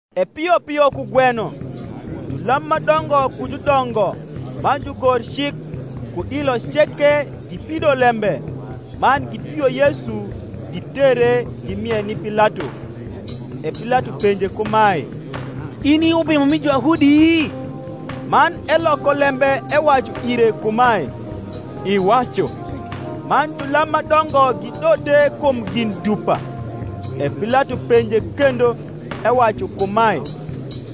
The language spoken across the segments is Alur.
E pio pio kugweno julam ma dongo ku judongo man jugorcik, ku dilo ceke, gipido lembe, man gitwio Yesu, gitere, gimie ni Pilato. E Pilato penje kumae, In i Ubimo mi Juyahudi? Man eloko lembe ewacu ire kumae, Iwacu. Man julam ma dongo gidote kum gin dupa. E Pilato penje kendo, ewacu kumae,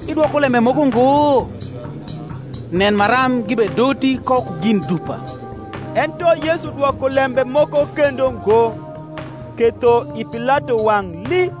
Idwoko lembe moko ngo? nen maram gibedoti ko ku gin dupa. Ento Yesu dwoko lembe moko kendo ngo; ketho i Pilato wang’ lii.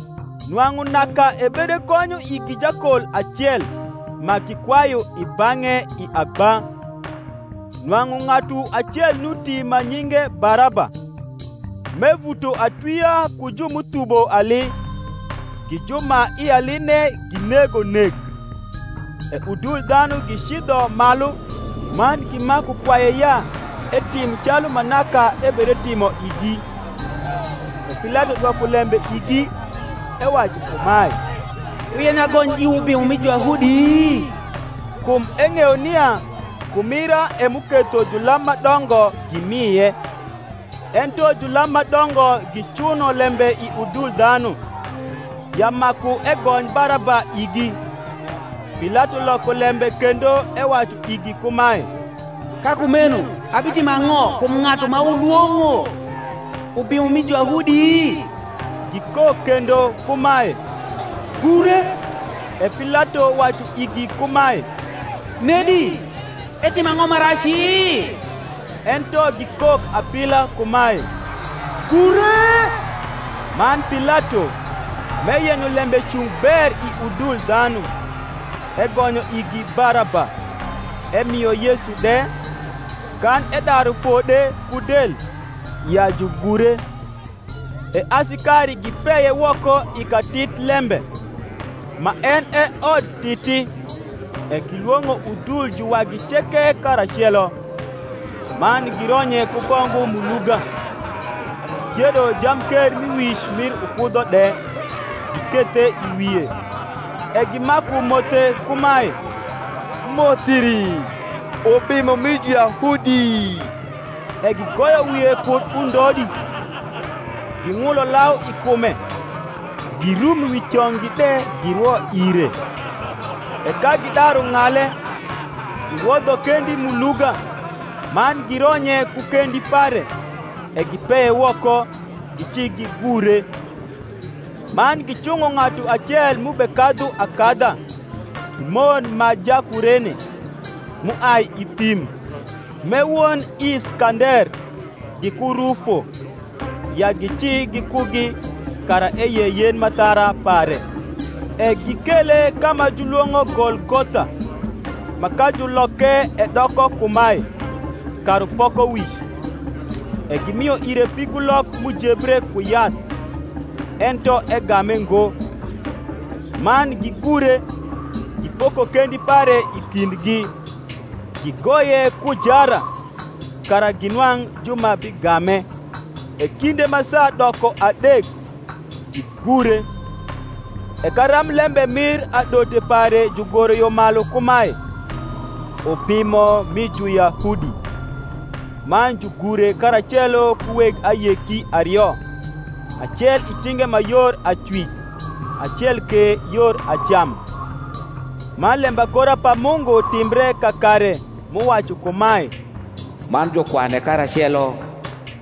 Nwang’u naka ebedegonyo igi jakol acel, ma gikwayu i bang’e i agba. Nwang’u ng’atu acel nuti ma nyinge Baraba, m’evuto atwia ku ju m’uthubo ali, gi ju ma i aline ginego nek. E udul dhanu gicidho malu man gimaku kwaye ya etim calu ma naka ebedetimo igi. E Pilato dwoko lembe igi, ewacu kumae, Wuyenyo agony iwu Ubimo mi Juyahudi? Kum eng’eyo nia kumira e m’uketho julam ma dongo gimie. Ento julam ma dongo gicuno lembe i udul dhanu, ya maku egony Baraba igi. Pilato loko lembe kendo ewacu igi kumae, Ka kumeno abitimo ang’o kum ng’atu ma wulwong’o Ubimo mi Juyahudi? Gikok kendo kumae, Gure. E Pilato wacu igi kumae, Nedi, etimo ang’o ma raci? Ento gikok apila kumae, Gure. Man Pilato, m’eyenyo lembe cung ber i udul dhanu, egonyo igi Baraba, emio Yesu de, kan edaru fode ku del, ya jugure. E asikari gipeye woko i katitlembe, ma en e Odtiti; e gilwong’o udul juwagi ceke karacelo. Man gironye ku bongu m’uluga, gikiedo jamkermiwic mir ukudho de, gikethe i wie; e gimaku mothe kumae, Moth iri, Ubimo mi Juyahudi! E gigoyo wie kud undodi, ging’ulo lau i kume, girum wi cong’gi de girwo ire. E ka gidaru ng’ale, giwodho kendi m’uluga, man gironye ku kendi pare. E gipeye woko, gicigigure. Man gicung’o ng’atu acel m’ubekadhu akadha, Simon ma Jakurene, m’uai i thim, m’e won Iskander giku Rufo, ya gici gikugi, kara eyei yen m’athara pare. E gikele ka ma julwong’o Golgotha, ma ka juloke edoko kumae, Karupokowic. E gimio ire pigulok m’ujebre ku yath: ento egame ngo. Man gigure, gipoko kendi pare i kindgi, gigoye ku jara, kara ginwang’ ju ma bigame. E kinde ma saa doko adek, gigure. E karamblembe mir adote pare jugoro yo malu kumae, UBIMO MI JUYAHUDI. Man jugure karacelo ku weg ayeki ario; acel i cinge ma yor acwic, acel ke yor acam. Man lembagora pa Mungu timbre kakare, m’uwacu kumae, Man jukwane karacelo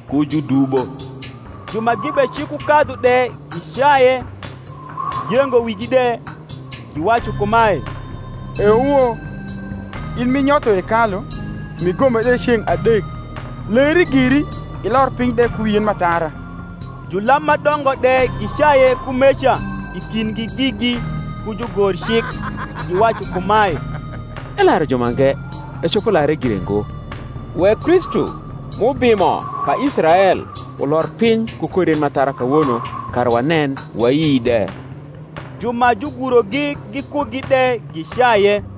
ku judubo. Ju ma gibecikukadhu de gicaye, giyengo wigi de, giwacu kumae, Euo! in m’inyotho hekalu, m’igome de ceng’ adek, leri giri, ilor piny de ku wi yen m’athara. Julam ma dongo de gicaye kumeca i kindgi gigi ku jugorcik, giwacu kumae, Elaru jumange; ecopo lare gire ngo. Wek Kristu m’Ubimo pa Israel, ulor piny ku kor yen m’athara kawono, kara wanen wayi de. Ju ma jugurogi gikugi de gicaye.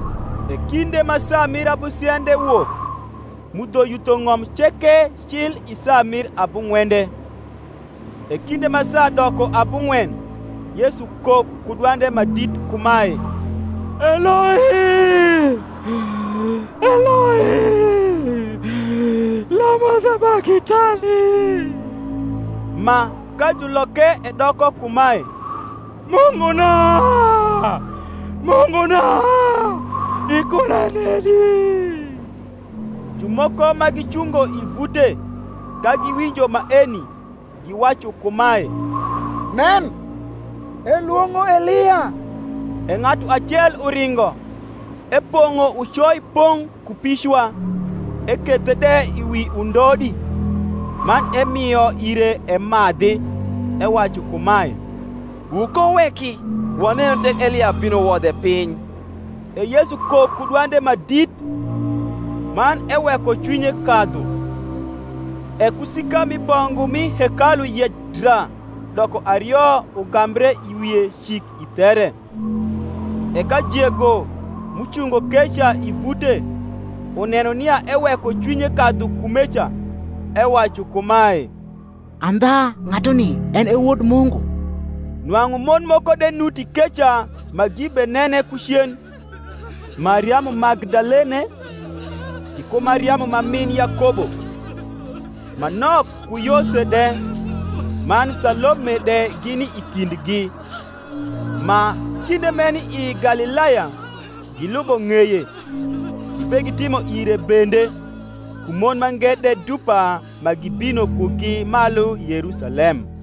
E kinde ma saa mir abusiende wok, mudho yutho ng’om ceke cil i saa mir abung’wende. E kinde ma saa doko abung’wen Yesu kok ku dwande ma dit kumae, Eloi, Eloi, lama sabakthani? ma, ka juloke edoko kumae, Munguna, Munguna, ikuna nedi? Jumoko ma gicungo i vute, ka giwinjo maeni, giwacu kumae, Nen, elwong’o Elia. E ng’atu acel uringo, epong’o ucoi pong’ ku picwa, ekethe de wi undodi, man emio ire emadhi, ewacu kumae, Wukowuweki; wanenu tek Elia bino wodhe piny. E Yesu kok ku dwande ma dit, man eweko cwinye kadhu. E kusika mi bongu m’i hekalu yec dra doko ario ugambre i wie cik i there. E ka jego, m’ucungo keca i vute, uneno nia eweko cwinye kadhu kumeca, ewacu kumae, Andha ng’atuni en e Wod Mungu. Nwang’u mon moko de nuti keca ma gibenene ku cen: Mariamu Magdalene, giku Mariamu ma min Yakobo ma nok ku Yose de, man Salome de gini i kindgi; ma, kinde m’eni i Galilaya, gilubo ng’eye, gibegitimo ire bende; ku mon mange de dupa ma gibino kugi malu Yerusalem.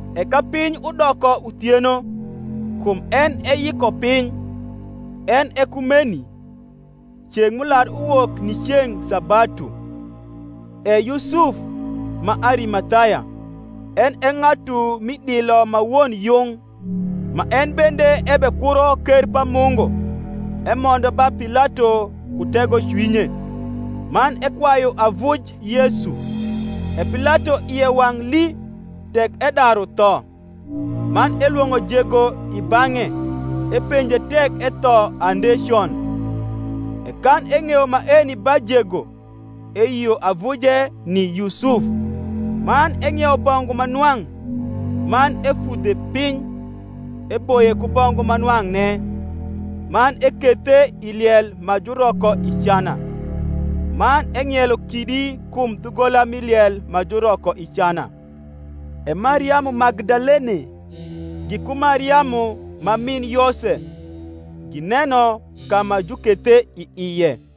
E ka piny udoko uthieno, kum en e Yikopiny, en e kumeni, ceng’ m’ular uwok ni ceng’ sabatu, e Yusuf ma Arimathaya, en e ng’atu m’i dilo ma won yung, ma en bende ebekuro ker pa Mungu; emondo ba Pilato ku tegocwinye, man ekwayu avuj Yesu. E Pilato ie wang’ lii tek edaru tho: man elwong’o jego i bang’e epenje tek etho ande con. E kan eng’eyo maeni ba jego eyio avuje ni Yusuf. Man eng’iewo bongu ma nwang’, man efudhe piny, eboye ku bongu ma nwang’ne, man ekethe i liel ma juroko i cana; man eng’ielo kidi kum dhugola mi liel ma juroko i cana. E Mariamu Magdalene giku Mariamu ma min Yose gineno ka ma jukethe i ie.